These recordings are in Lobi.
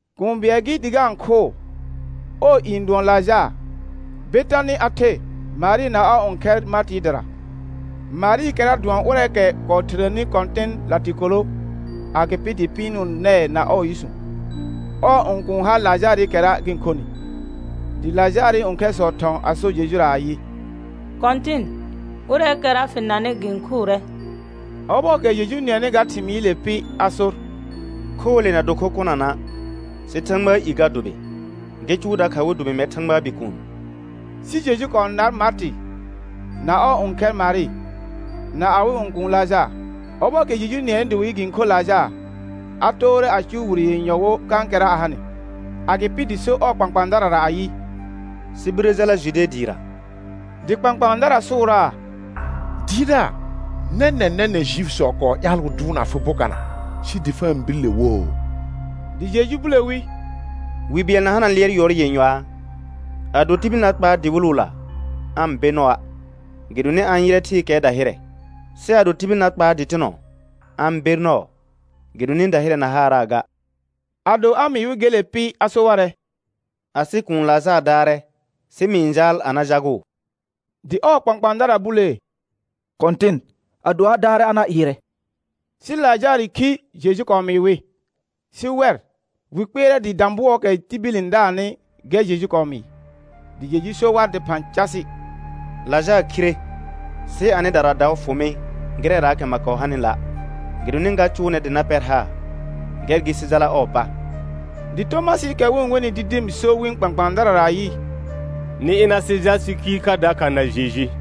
Kũu bɩɛl gɩ dɩ ga-n khʋʋ. Ɔɔ i n dʋɔn Lajaar; Betanɩ a the Marɩ na ɔɔ õkhɛr Martɩɩ dɩra. Marɩɩkɛra dʋɔn ʋrɛɛkɛ kɔɔ thirəni Kɔ̃tɩn latɩkolo, agɩpɩ dɩ pɩɩnʋʋ nɛɛ na ɔɔ yʋsũ. Ɔɔ õkuun ha Lajaarɩkɛra gɩ-n khonɩ. Dɩ Lajaarɩ õkhɛrsɔ thɔ̃ a so Jejura ayɩ: Kɔ̃tɩn, ʋrɛɛkɛra fɩ nanɩ gɩ-n khʋʋrɛ. Ɔbɔɔkɛ Jeju nɩɛnɩ ga thɩmɩɩle pɩ a sor: Khoole na do kho kʋnana', sɩ Thãgbaa i ga dʋbɩ, gɩ cʋʋ dakha wɩ dʋbɩ mɛr Thãgbaa Bikuun. Sɩ Jeju kɔɔ nar Martɩ, na ɔɔ õkhɛr Marɩ, na awɩ õkuun Lajaar. Ɔbɔɔkɛ Jeju nɩɛnɩ dɩ wɩ yɩ gɩ-n khor Lajaar, a toore a cʋʋ wire yenyɔ wo kãkɛra a hanɩ. Agɩpɩ dɩ so ɔɔ kpãkpãadarara ayɩ: Sɩ birə jala Jude dɩɩra. Dɩ kpãkpãadara sʋʋraa: Dɩɩrdaar, nɛnɛ̃ nɛnɛ̃ Juifisɔ kɔɔ ƴaal wɩ dʋʋrna fɩ bokana sɩ dɩ fa-n bir le woo? Dɩ Jeju bule wi: Wi bɩɛl na hana lɩɛr yʋɔr yenyɔaa? Ado tibil na kpaar dɩwɩlʋla, aa-n be nɔa' gɩdonɩ a-n yɩrɛ thɩɩkɛɛ dahɩrɛ. Sɩ ado tibil na kpaar dɩtɩnɔ, a-n ber nɔɔ gɩdonɩ dahɩrɛɛ na haaraa ga. Ado a mɩɩ wɩ gele pɩ a so warɛ: Asɩ kuun Lajaar daarɛ, sɩ mɩ-n jaal a na jagʋʋ. Dɩ ɔɔ kpãkpãadara bulee: Kɔ̃tɩn, ado a daarɛ a na ɩɩrɛ. Sɩ Lajaarɩ khi Jeju kɔɔ mɩɩ wɩ. Sɩ wɛr, wɩ kpɩɛrɛ dɩ dã bʋɔɔkɛ tibil n daarnɩ gɛr Jeju kɔɔ mɩɩ. Dɩ Jeju so war dɩphã casɩ: Lajaar khire. Sɩ anɩdara daʋ fʋ mɩ gɩrɛraakɛ ma kɔɔ hanɩla', gɩdonɩ ga cʋʋ nɛr dɩ na pɛr haar. Gɛr gɩ sɩ jala ɔɔ pa. Dɩ Tomasɩɩkɛ wɩ-n wenɩ Didim so wɩ̃ kpãkpãadarara ayɩ: Nɩ ɩna sɩ jal sɩ khiir kha dakha na Jeju.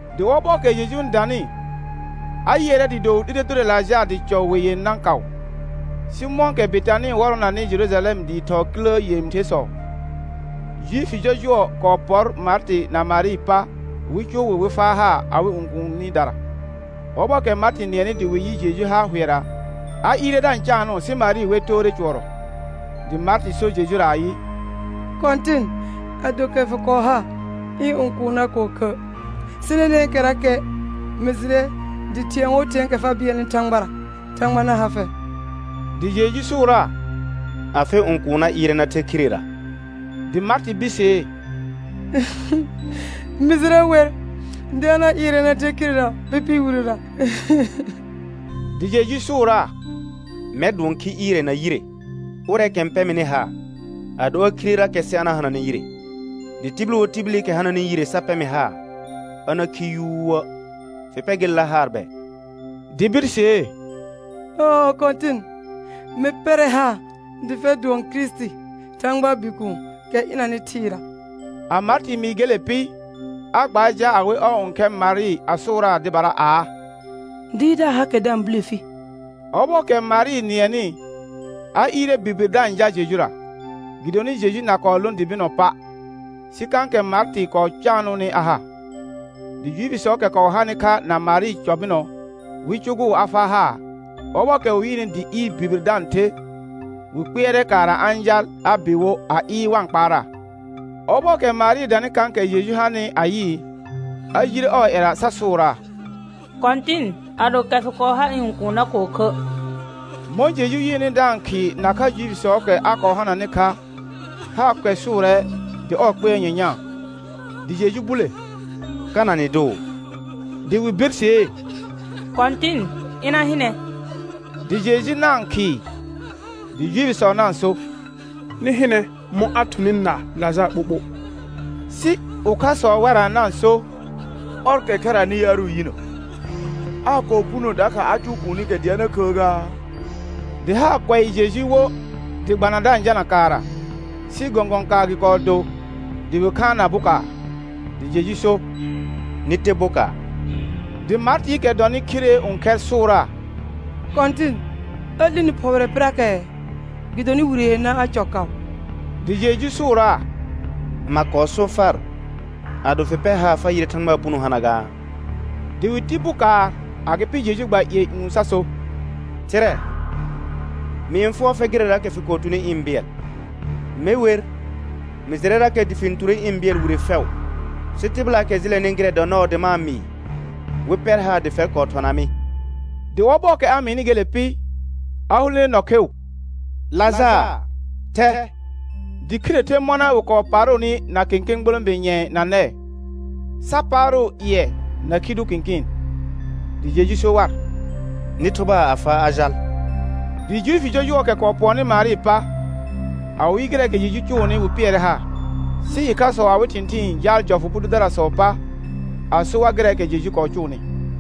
Dɩ ɔbɔɔkɛ Jeju n danɩ, a yɩɛrɛ dɩɩ do wɩ 'lire dʋrɛ Lajaar dɩ cɔ we yenã kaʋ. Sɩ mɔ̃kɛ Betanɩ wɔrɔnanɩ Jerujalɛm dɩɩ thɔɔ kilə yẽthersɔ, Juifi jɔjʋɔsɔ kɔɔ pɔr Martɩ na Marɩɩ pa wɩ cʋʋ wɩ wɩ faa haar awɩ õkuunidara. Ɔbɔɔkɛ Martɩ nɩɛnɩ dɩ wɩ yɩ Jeju har hʋɛra, a ɩɩrɛ da-n caanʋʋ sɩ Marɩ wer toore cʋɔrɔ. Dɩ Martɩ so Jejura ayɩ: Kɔ̃tɩn, ado kɛ fɩ kɔɔ ha ɩ̃ õkuun na kɔɔ khə'. Sɩ nɛnɛ̃kɛrakɛ mɩ jɩrɛ dɩ thɩ̃ɛ wo thɩ̃ɛɛkɛ fa bɩɛlnɩ Thãgbara, Thãgba na ha fɛr. Dɩ Jeju sʋʋraa: Afɩ õkuun na ɩɩrɛ na the khirera. Dɩ Martɩ birsee: Mɩ jɩrɛ wer dɩ a na ɩɩrɛ na the khirera pɩpɩɩ wirera. Dɩ Jeju sʋʋraa: Mɛr dʋɔn khi ɩɩrɛ na yire. Ʋrɛɛkɛ n pɛ mɩnɩ haar, ado a khirerakɛ sɩ a na hananɛ yire. Dɩ tibil wo tibilikɛ hananɩ yire sa pɛ mɩ haar, a na khi yuuə'. Fɩ pɛ gelela haar bɛ? Dɩ birsee: Ɔɔ Kɔ̃tɩn, mɩ pɛrɛ haar dɩ fɛr dʋɔn Kirisiti Thãgbaa Bikuun, kɛ ɩnanɩ thɩɩra. A Martɩ mɩɩ gelela pɩ, a gbaar jal a we ɔɔ õkhɛr Marɩ a sʋʋraa dɩbara aa: Dɩɩrdaar hakɛ da-n bule fi. Ɔbɔɔkɛ Marɩ nɩɛnɩ, a ɩɩrɛ birbir da-n jal Jejura, gɩdonɩ Jeju na kɔɔ lõ dɩ bɩnɔ pa', sɩ kãkɛ Martɩ kɔɔ caanʋʋnɩ a ha. Dɩ Juifisɔɔkɛ kɔɔ hanɩ kha na Marɩ cɔ bɩnɔ wɩ cʋgʋʋ a faa haar, ɔbɔɔkɛ wɩ yɩɩnɩ dɩ ɩɩr birbir da-n the, wɩ kpɩɛrɛ kaara a-n jal a bɩ wo a ɩɩr wa-n kpaaraa. Ɔbɔɔkɛ Marɩ danɩ kãkɛ Jeju hanɩ a yɩɩ, a jire ɔɔ ƴɛra sa sʋʋraa: Kɔ̃tɩn, ado kɛ fɩ kɔɔ ha ɩ̃ õkuun na kɔɔ khə'. Mɔ̃ Jeju yɩɩnɩ da-n khɩɩ nakha Juifisɔɔkɛ a kɔɔ hananɩ kha, haar kʋɛsʋʋrɛ dɩ ɔɔ kpɩɛr nyanyãa. Dɩ Jeju bule: Kana nɩ dʋʋ? Dɩ wɩ birsee: Kɔ̃tɩn, ɩna hɩnɛ. Dɩ Jeju na-n khɩɩ. Dɩ Juifisɔ na-n so: Nɩ hɩnɛ mɔ̃ a thʋnɩ na Lajaar ɓoɓo. Sɩ ʋkhasɔ wɛrra na-n so: Ɔrkɛ khɛranɩ yaarʋ yinə, aa kɔɔ puno dakha a cʋʋ kuunikɛ dɩ a na khəə gaa? Dɩ haar kʋɛ Jeju wo dɩ gbana da-n jalna kaara. Sɩ gɔ̃gɔ̃ kaar gɩ kɔɔ do dɩ wɩ khaanna bokaar. Dɩ Jeju so: Nɩ te bokaar. Dɩ Martɩɩkɛ dɔnɩ khiree õkhɛr sʋʋraa: Kɔ̃tɩn a 'lini phɔɔrɛ pɩrakɛɛ, gɩdonɩ wire yenã a cɔ kaʋ. Dɩ Jeju sʋʋraa: Ma kɔɔ so far, ado fɩ pɛr haar fa yɩrɛ Thãgbaa puno hana gaa? Dɩ wɩ ti bokaar. Agɩpɩ Jeju gba ƴɩɛ ƴũ sa so: Thɩrɛ, mɩ-n fʋɔr fɛr gɩrɛraakɛ fɩ kɔɔ tuni ɩ̃ bɩɛl. Me wer, mɩ jɩrɛrakɛ dɩ fɩ-n ture ɩ̃ bɩɛl wire fɛʋ, sɩ tɩbɩlaakɛ jɩlɛnɩ gɩrɛ dɔ nɔɔ dɩ ma-n mɩɩ, wɩ pɛr haar dɩ fɛr kɔɔ thɔna mɩ. Dɩ ɔbɔɔkɛ a mɩɩnɩ gele pɩ, a hulene nɔ kheu: Lajaar, thɛ. Dɩ khire the mɔna wɩ kɔɔ paarʋʋnɩ na kẽkẽ gborõbe nƴɛ̃ɛ na nɛɛ, sa paarʋʋ ƴɩɛ na khi dʋ kɩ̃kɩɩn. Dɩ Jeju so war: Nɩ thʋbaa a faa a jal. Dɩ Juifi jɔjʋɔɔkɛ kɔɔ pʋɔnnɩ Marɩɩ pa, a wɩ yɩ gɩrɛɛkɛ Jeju cʋʋnɩ wɩ pɩɛrɛ haar. Sɩ ɩkhasɔ awɩ thɩ̃thɩɩn jaal jɔfʋ bʋ dʋdarasɔɔ pa, a so war gɩrɛɛkɛ Jeju kɔɔ cʋʋnɩ.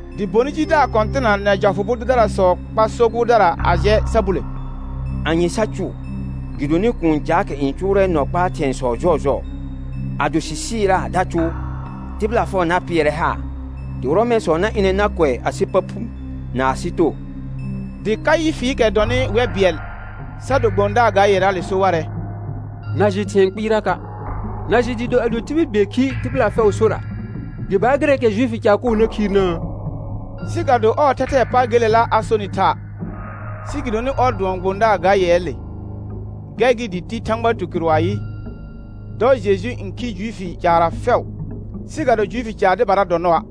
Dɩ bonɩ jidaar kɔ̃tɩna na jɔfʋ bʋ dʋdarasɔ kpar so gʋʋrdara a jɛ sa bule: Anye sa cʋʋ? Gɩdonɩ kũu caakɛ n cʋʋrɛ nɔ kpaa thɩ̃ɛsɔ jɔɔjɔɔ. Ado sɩ sɩɩraa da cʋʋ, tɩbɩla fɛʋ na pɩɛrɛ haar, dɩ Rɔmɛ̃sɔ na ɩnɛ na kʋɛ asɩ pa phu na asɩ too. Dɩ Kaɩfɩɩkɛ dɔnɩ wɛr bɩɛl, sa do gbõdaar ga yɛraale so warɛ: Na jɩ thɩ̃ɛ kpɩɩraka'. Na jɩ dɩɩ do ado tibil bɩɛl khi tɩbɩla fɛʋʋ sora, gɩ baar gɩrɛɛkɛ Juifi caar koo na khiirnəə? Sɩ ga do ɔɔ thɛthɛɛ pa gelela a sonɩ tha', sɩ gɩdonɩ ɔr dʋɔn gbõdaar ga yɛɛle, gɛr gɩ dɩ ti Thãgba tukɩrʋ ayɩ: Dɔ Jeju n khi Juifi caarra fɛʋ. Sɩ ga do Juifi caar dɩbara dɔ nɔa',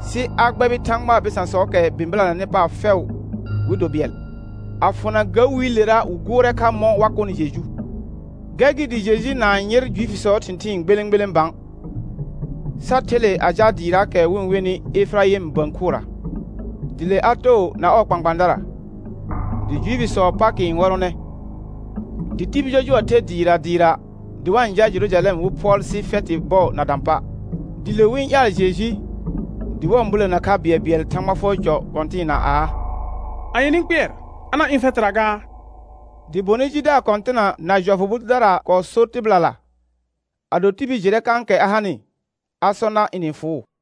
sɩ a gbɛbɩ Thãgbaa bɩsãsɔɔkɛ bɩ̃bɩlanɛnɩ paar fɛʋ wɩ do bɩɛl. A fʋna ga wiilera wɩ gʋʋrɛ kha mɔ̃ wa kʋnɩ Jeju. Gɛr gɩ dɩ Jeju na-n yɩr Juifisɔɔ thɩ̃thɩɩn gbelẽ gbelẽ bã, sa the le a jal dɩɩraakɛ wɩ-n wenɩ Efɩraɩm bə̃ khʋra. Dɩ le a too na ɔɔ kpãkpãadara. Dɩ Juifisɔɔ Pakɩ n wɔrɔnɛ. Dɩ tibil jɔjʋɔ the dɩɩra dɩɩra dɩ wa-n jal Jerujalɛm wɩ phʋɔl sɩ fɛtɩ bɔɔ na dã pa'. Dɩ le wɩ-n ƴaal Jeju, dɩ wa-n bulena kha bɩɛlbɩɛl Thãgba fʋɔr cɔ kɔ̃tɩɩna aa: Anye nɩ-n kpɩɛr? A na ɩ̃ fɛtɩra gaa? Dɩ bonɩ jidaar kɔ̃tɩna na jɔfʋ bʋ dʋdara kɔɔ sor tɩbɩlala, ado tibil jɩrɛ kãkɛ a hanɩ, a sɔ nar ɩnɩ-n fʋʋ.